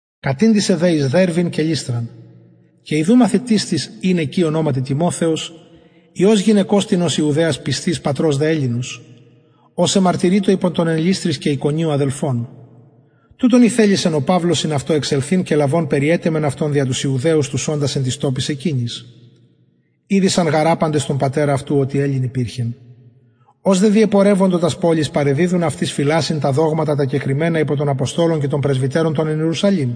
κατηντησεν δε εις δερβην και λυστραν και ιδου μαθητης τις ην εκει ονοματι τιμοθεος υιος γυναικος τινος ιουδαιας πιστης πατρος δε ελληνος ος εμαρτυρειτο υπο των εν λυστροις και ικονιω αδελφων τουτον ηθελησεν ο παυλος συν αυτω εξελθειν και λαβων περιετεμεν αυτον δια τους ιουδαιους τους οντας εν τοις τοποις εκεινοις ηδεισαν γαρ απαντες τον πατερα αυτου οτι ελλην υπηρχεν ως δε διεπορευοντο τας πολεις παρεδιδουν αυτοις φυλασσειν τα δογματα τα κεκριμενα υπο των αποστολων και των πρεσβυτερων των εν ιερουσαλημ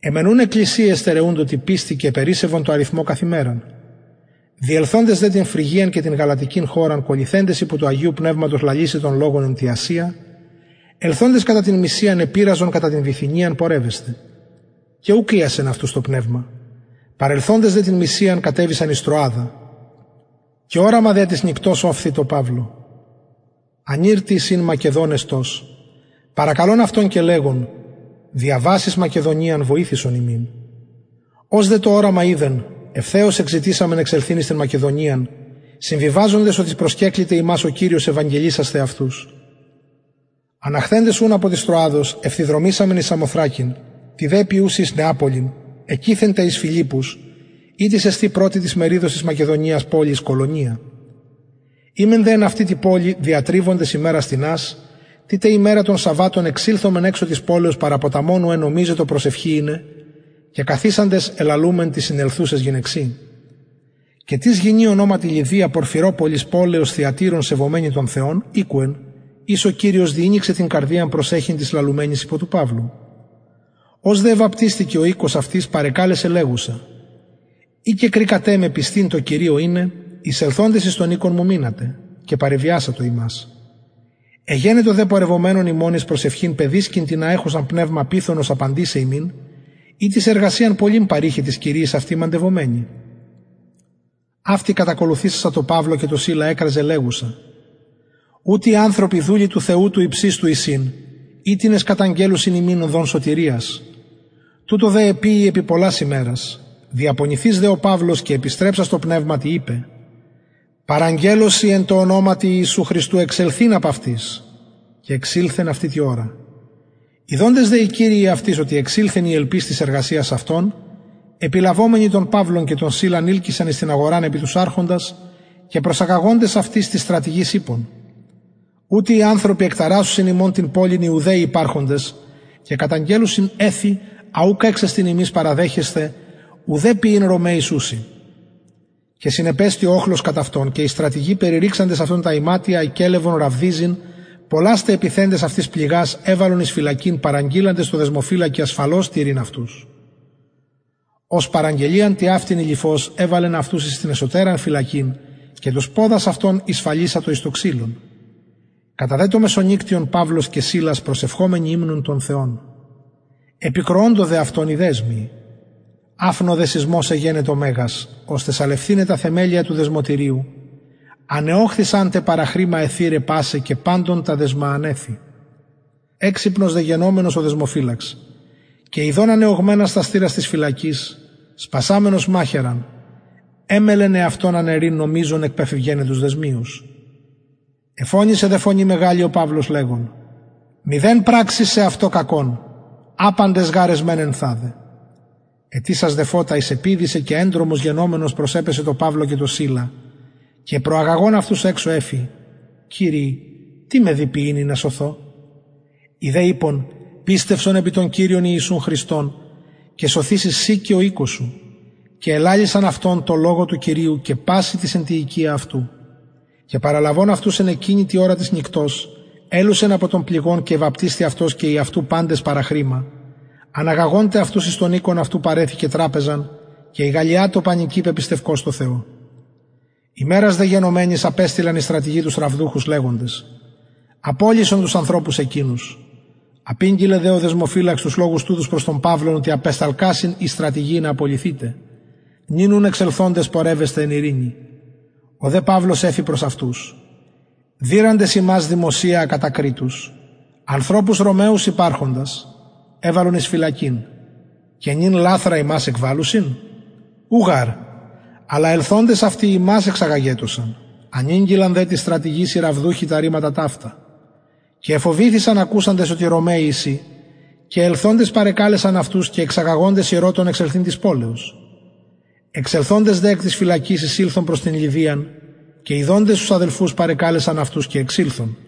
αι μεν ουν εκκλησιαι εστερεουντο τη πιστει και επερισσευον τω αριθμω καθ ημεραν διελθοντες δε την φρυγιαν και την γαλατικην χωραν κωλυθεντες υπο του αγιου πνευματος λαλησαι τον λογον εν τη ασια ελθοντες κατα την μυσιαν επειραζον κατα την βιθυνιαν πορευεσθαι και ουκ ειασεν αυτους το πνευμα παρελθοντες δε την μυσιαν κατεβησαν εις τρωαδα και οραμα δια της νυκτος ωφθη τω παυλω ανηρ τις ην μακεδων εστως παρακαλων αυτον και λεγων διαβας εις μακεδονιαν βοηθησον ημιν ως δε το οραμα ειδεν ευθεως εζητησαμεν εξελθειν εις την μακεδονιαν συμβιβαζοντες οτι προσκεκληται ημας ο κυριος ευαγγελισασθαι αυτους αναχθεντες ουν απο της τρωαδος ευθυδρομησαμεν εις σαμοθρακην τη τε επιουση εις νεαπολιν εκειθεν τε εις φιλιππους ητις εστιν πρωτη της μεριδος της μακεδονιας πολις κολωνεια ημεν δε εν αυτη τη πολει διατριβοντες ημερας τινας τη τε ημερα των σαββατων εξηλθομεν εξω της πολεως παρα ποταμον ου ενομιζετο προσευχη ειναι και καθισαντες ελαλουμεν ταις συνελθουσαις γυναιξιν και τις γυνη ονοματι λυδια πορφυροπωλις πολεως θυατειρων σεβομενη τον θεον ηκουεν ης ο κυριος διηνοιξεν την καρδιαν προσεχειν τοις λαλουμενοις υπο του παυλου ως δε εβαπτισθη και ο οικος αυτης παρεκαλεσεν λεγουσα ει κεκρικατε με πιστην τω κυριω ειναι εισελθοντες εις τον οικον μου μεινατε και παρεβιασατο ημας εγενετο δε πορευομενων ημων εις προσευχην παιδισκην τινα εχουσαν πνευμα πυθωνος απαντησαι ημιν ητις εργασιαν πολλην παρειχεν τοις κυριοις αυτης μαντευομενη αυτη κατακολουθησασα τω παυλω και ημιν εκραζεν λεγουσα ουτοι οι ανθρωποι δουλοι του θεου του υψιστου εισιν οιτινες καταγγελλουσιν ημιν οδον σωτηριας τουτο δε εποιει επι πολλας ημερας διαπονηθεις δε ο παυλος και επιστρεψας τω πνευματι ειπεν παραγγελλω σοι εν τω ονοματι ιησου χριστου εξελθειν απ αυτης και εξηλθεν αυτη τη ωρα ιδοντες δε οι κυριοι αυτης οτι εξηλθεν η ελπις της εργασιας αυτων επιλαβομενοι τον παυλον και τον σιλαν ειλκυσαν εις την αγοραν επι τους αρχοντας και προσαγαγοντες αυτους τοις στρατηγοις ειπον ουτοι οι ανθρωποι εκταρασσουσιν ημων την πολιν ιουδαιοι υπαρχοντες και καταγγελλουσιν εθη α ουκ εξεστιν ημιν παραδεχεσθαι ουδε ποιειν ρωμαιοις ουσιν και συνεπεστη ο οχλος κατ αυτων και οι στρατηγοι περιρρηξαντες αυτων τα ιματια εκελευον ραβδιζειν πολλας τε επιθεντες αυτοις πληγας εβαλον εις φυλακην παραγγειλαντες τω δεσμοφυλακι ασφαλως τηρειν αυτους ος παραγγελιαν τοιαυτην ειληφως εβαλεν αυτους εις την εσωτεραν φυλακην και τους ποδας αυτων ησφαλισατο εις το ξυλον κατα δε το μεσονυκτιον παυλος και σιλας προσευχομενοι υμνουν τον θεον επηκροωντο δε αυτων οι δεσμιοι αφνω δε σεισμος εγενετο μεγας ωστε σαλευθηναι τα θεμελια του δεσμωτηριου ανεωχθησαν τε παραχρημα αι θυραι πασαι και παντων τα δεσμα ανεθη εξυπνος δε γενομενος ο δεσμοφυλαξ και ιδων ανεωγμενας τας θυρας της φυλακης σπασαμενος μαχαιραν εμελλεν εαυτον αναιρειν νομιζων εκπεφευγεναι τους δεσμιους εφωνησεν δε φωνη μεγαλη ο παυλος λεγων μηδεν πραξης σεαυτω κακον απαντες γαρ εσμεν ενθαδε αιτησας δε φωτα εισεπηδησεν και εντρομος γενομενος προσεπεσεν τω παυλω και τω σιλα και προαγαγων αυτους εξω εφη κυριοι τι με δει ποιειν ινα σωθω οι δε ειπον πιστευσον επι τον κυριον ιησουν χριστον και σωθηση συ και ο οικος σου και ελαλησαν αυτω τον λογον του κυριου και πασιν τοις εν τη οικια αυτου και παραλαβων αυτους εν εκεινη τη ωρα της νυκτος ελουσεν απο των πληγων και εβαπτισθη αυτος και οι αυτου παντες παραχρημα αναγαγων τε αυτους εις τον οικον αυτου παρεθηκεν τραπεζαν και ηγαλλιατο πανοικι πεπιστευκως τω θεω ημερας δε γενομενης απεστειλαν οι στρατηγοι τους ραβδουχους λεγοντες απολυσον τους ανθρωπους εκεινους απηγγειλεν δε ο δεσμοφυλαξ τους λογους τουτους προς τον παυλον οτι απεσταλκασιν οι στρατηγοι ινα απολυθητε νυν ουν εξελθοντες πορευεσθε εν ειρηνη ο δε παυλος εφη προς αυτους δειραντες ημας δημοσια ακατακριτους ανθρωπους ρωμαιους υπαρχοντας εβαλον εις φυλακην και νυν λαθρα ημας εκβαλλουσιν ου γαρ αλλα ελθοντες αυτοι εξαγαγετωσαν ανηγγειλαν δε τοις στρατηγοις οι ραβδουχοι τα ρηματα ταυτα και εφοβηθησαν ακουσαντες οτι ρωμαιοι εισιν και ελθοντες παρεκαλεσαν αυτους και εξαγαγοντες ηρωτων εξελθειν της πολεως εξελθοντες δε εκ της φυλακης εισηλθον προς την λυδιαν και ιδοντες τους αδελφους παρεκαλεσαν αυτους και εξηλθον